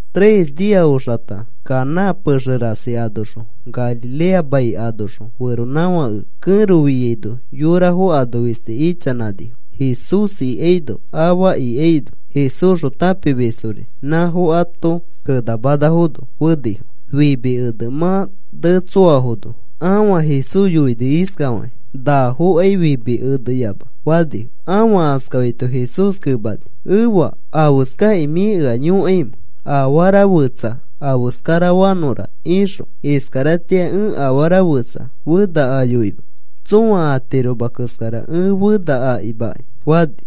Tres nia oxakata Caná pexe rasi anoxõ Galilea mai anoxõ feronãfãke kẽro fiaino yorafo ano fisti ichanãnifo. Jesús ikaino afa ikaino Jesúsxõ tãpimisfori nãfo ato kenamanafono fenifo. Fimi ene mã netsoafono, ãfa Jesús yoini iskafakĩ: “Nafokai fimi eneyama,” fani. Ãfa askafaito Jesús kemani: “Efa, ¿afeskakĩ mĩ ea yõkaimẽ afara fetsa afeskarafanõra ixõ? Iskaratĩa ẽ afara fetsa fena ayoima. Tsõa atiroma keskara ẽ fena akimakai,” fani.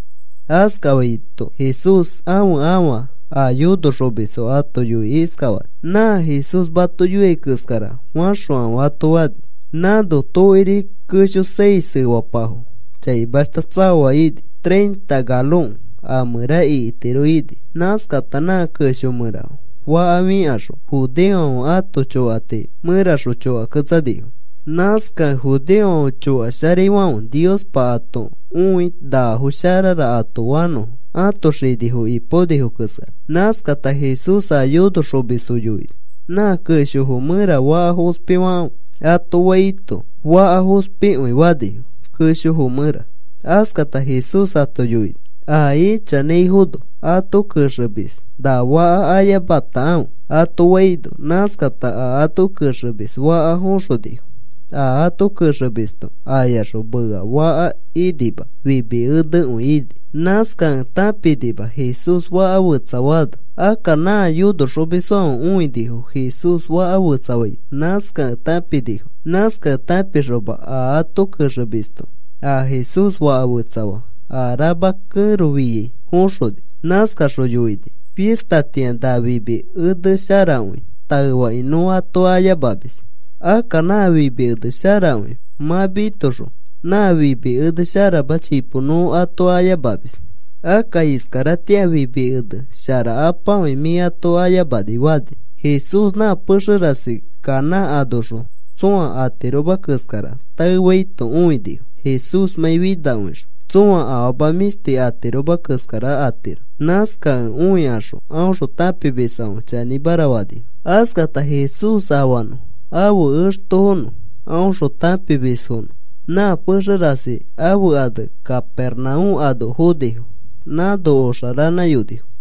Askafaito Jesús ãfe ãfa a yonoxomisfo ato yoikĩ iskafani: “Nã Jesús mato yoiai keskara faxokãfe,” ato fani. Nãno tokiri kesho seis efapafo chaimashta tsaoa ini. Treinta galon a mẽra ikitiro ini. Nãskata nã kesho mẽra faka fikaxõ, judeofãfe ãto chokati mẽraxõ chokaketsanifo. Nãskakĩ judeofãfe chokasharaifãfe Niospa ato õi nafo sharara ato fanõ, ãto xinifo ipaonifo keskara. Nãskata Jesús a yonoxomisfo yoini: “Nã keshofo mẽra faka fospifakãfe,” ato faito, faka fospikõi fanifo keshofo mẽra. Askata Jesús ato yoini: “A ichanãifono ato kexemis na faka ayamatakãfe,” ato faino, nãskata a ato kexemis faka foxonifo. A ato kexemisto ayaxõ mea faka inima fimi enekõi ini. Nãskakẽ tãpinima Jesús faka fetsafaano. (Akka nã yonoxomisfãfe õinifo Jesús faka fetsafaito. Nãskakẽ tãpinifo.) Nãskakẽ tãpixoma a ato kexemisto a Jesús faka fetsafaa a rama kẽro fĩai foxoni. Nãskaxõ yoini: “Fistatĩa nã fimi ene sharakõi taefakĩ nõ ato ayamamis. Akka nã fimi ene sharakõi mã mitoxõ, nã fimi ene sharama chipo nõ ato ayamamis. Akka iskaratĩa fimi ene sharakapakõi mĩ ato ayamani,” fani. Jesús nã pexe rasi Caná anoxõ tsõa atiroma keskara taefaito õinifo Jesúsmãi finakõixõ tsõa afama mĩshti atiroma keskara atiro. Nãskakẽ õikaxõ aõxõ tãpimisfãfe chanĩmara fanifo. Askata Jesús afanõ ãfe extofonõ aõxõ tãpimisfonõ nã pexe rasi ãfe ane Capernaúm ano fonifo. Nãno oxa ranãyonifo.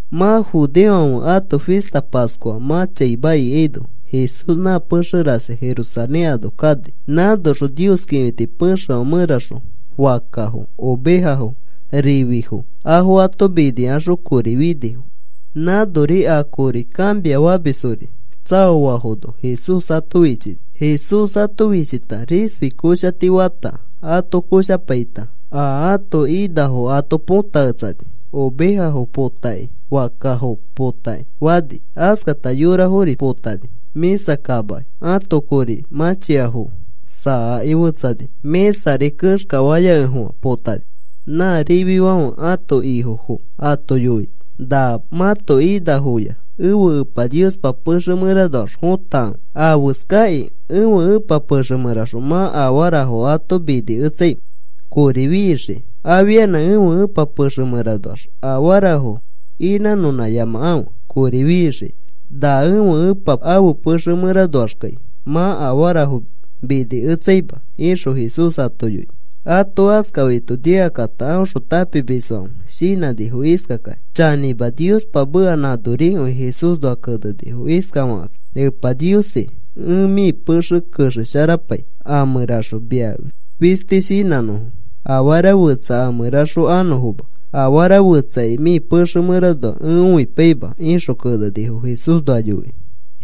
Mã judeofãfe ãto fista Pascua mã chaima ikaino Jesús nã pexe rasi Jerusalén ano kani. Nãnoxõ Nios kĩfiti pexefã mẽraxõ fakkafo, ovejafo, rififo afo ato minikaxõ kori finifo. Nãnori a kori kãmiafamisfori tsaoafono Jesús ato fichini. Jesús ato fichita risfi koshati fata ato koshapaita a ato inafo ato põtaketsani. Ovejafo potakĩ, fakkafo potakĩ fani. Askata yorafori potani. Mĩsa kamaki ãto kori mãchiafo saakĩ fetsani. Mĩsari kexkafaya kekẽfofã potani. Nã rififãfe ãto ifofo ato yoini: “Na mãto inafoya ẽfe Epa Niospa pexe mẽranoax fotakãfe. ¿Afeskakĩ ẽfe Ẽpa pexe mẽraxõ mã afarafo ato miniketsaimẽ kori fixikĩ? Afianã ẽfe Ẽpa pexe mẽranoax afarafo inãnõnãyamakãfe kori fixikĩ. Na ẽfe Epa ãfe pexe mẽranoaxkai mã afarafo minimitsaima,” ixõ Jesús ato yoini. Ato askafaito nikakata aõxõ tãpimisfãfe shinãnifo iskakakĩ: “Chanĩma, Niospa meka nãnorikõi Jesúsnoa kenenifo iskafakakĩ: ‘Epa Niosi, ẽ mĩ pexe kexesharapai a mẽraxõ mia fisti shinãnõfo. Afara fetsa a mẽraxõ anõfoma. Afara fetsakai mĩ pexe mẽranoa ẽ õipaima,’ ixõ kenenifo Jesúsnoa yoikĩ.”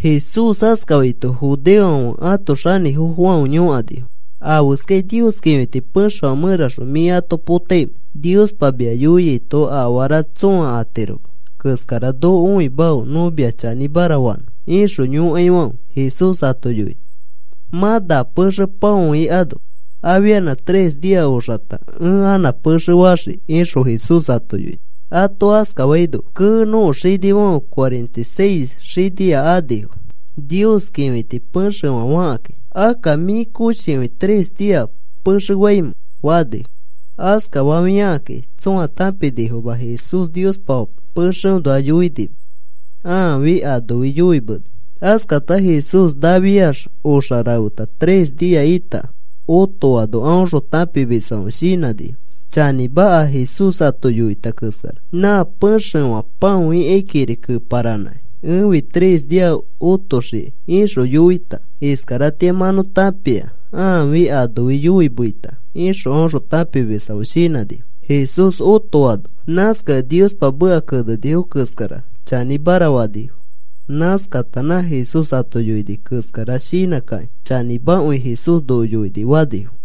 Jesús askafaito judeofãfe ãto xanĩfofofãfe yõkanifo: “¿Afeskakĩ Nios kĩfiti pexefã mẽraxõ mĩ ato potaimẽ? Niospa mia yoiaito afara tsõa atiroma keskara noko õimafe nõ mia chanĩmara fanõ,” ixõ yõkaifãfe Jesús ato yoini: “Mã na pexe pãoikano afianã tres nia oxata ẽ anã pexe faxii,” ixõ Jesús ato yoini. Ato askafaino, “Kee. Nõko xinifãfe cuarenta y seis xinia anifo Nios kĩfiti pexefã fakakĩ. Akka, ¿mĩ koshikõi tres nia pexe faimẽ?” fanifo. Askafafiakakĩ tsõa tãpinifoma Jesús Niospa pexeõnoa yoinima. Aafi anofi yoimeni. Askata Jesús nafiax oxa rafeta tres nia ĩta otoano aõxõ tãpimisfãfe shinãnifo: “Chanĩma, a Jesús ato yoita keskara, nã pexefã pãoikaikiri keparanãkĩ, ‘Ẽfi tres nia otoxii,’ ixõ yoita. Iskaratĩa mã nõ tãpia aafi anofi yoimeita,” ixõ aõxõ tãpimisfãfe shinãnifo Jesús otoano. Nãskakẽ Niospa meka kenenifo keskara chanĩmara fanifo. Nãskata nã Jesús ato yoini keskara shinãkakĩ: “Chanĩmakõi Jesús noko yoini,” fanifo.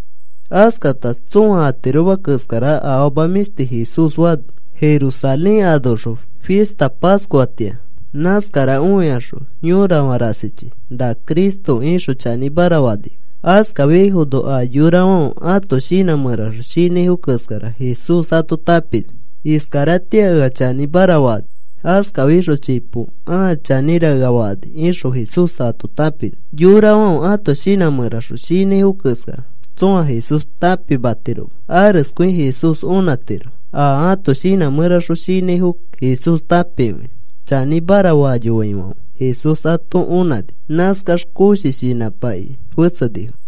Askata tsõa atiroma keskara afama mĩshti Jesús fani Jerusalén anoxõ fista Pascuatĩa. Nãskara õikaxõ yorafã rasichi, “Na Cristo,” ixõ chanĩmara fanifo. Askafiaifono a yorafãfe ãto shinã mẽraxõ shinãifo keskara Jesús ato tãpini. (“Iskaratĩa ea chanĩmara fakani. Askafikaxõ chipo, ãa chanĩra, ea fakani,” ixõ Jesús ato tãpini.) Yorafãfe ãto shinã mẽraxõ shinãifo keskara tsõa Jesús tãpimatiroma. Areskõi Jesús onãtiro a ãto shinã mẽraxõ shinãifo Jesús tãpikõia. Chanĩmara fayoaifãfe Jesús ato onãni nãskax koshi shinãmakĩ fetsenifo.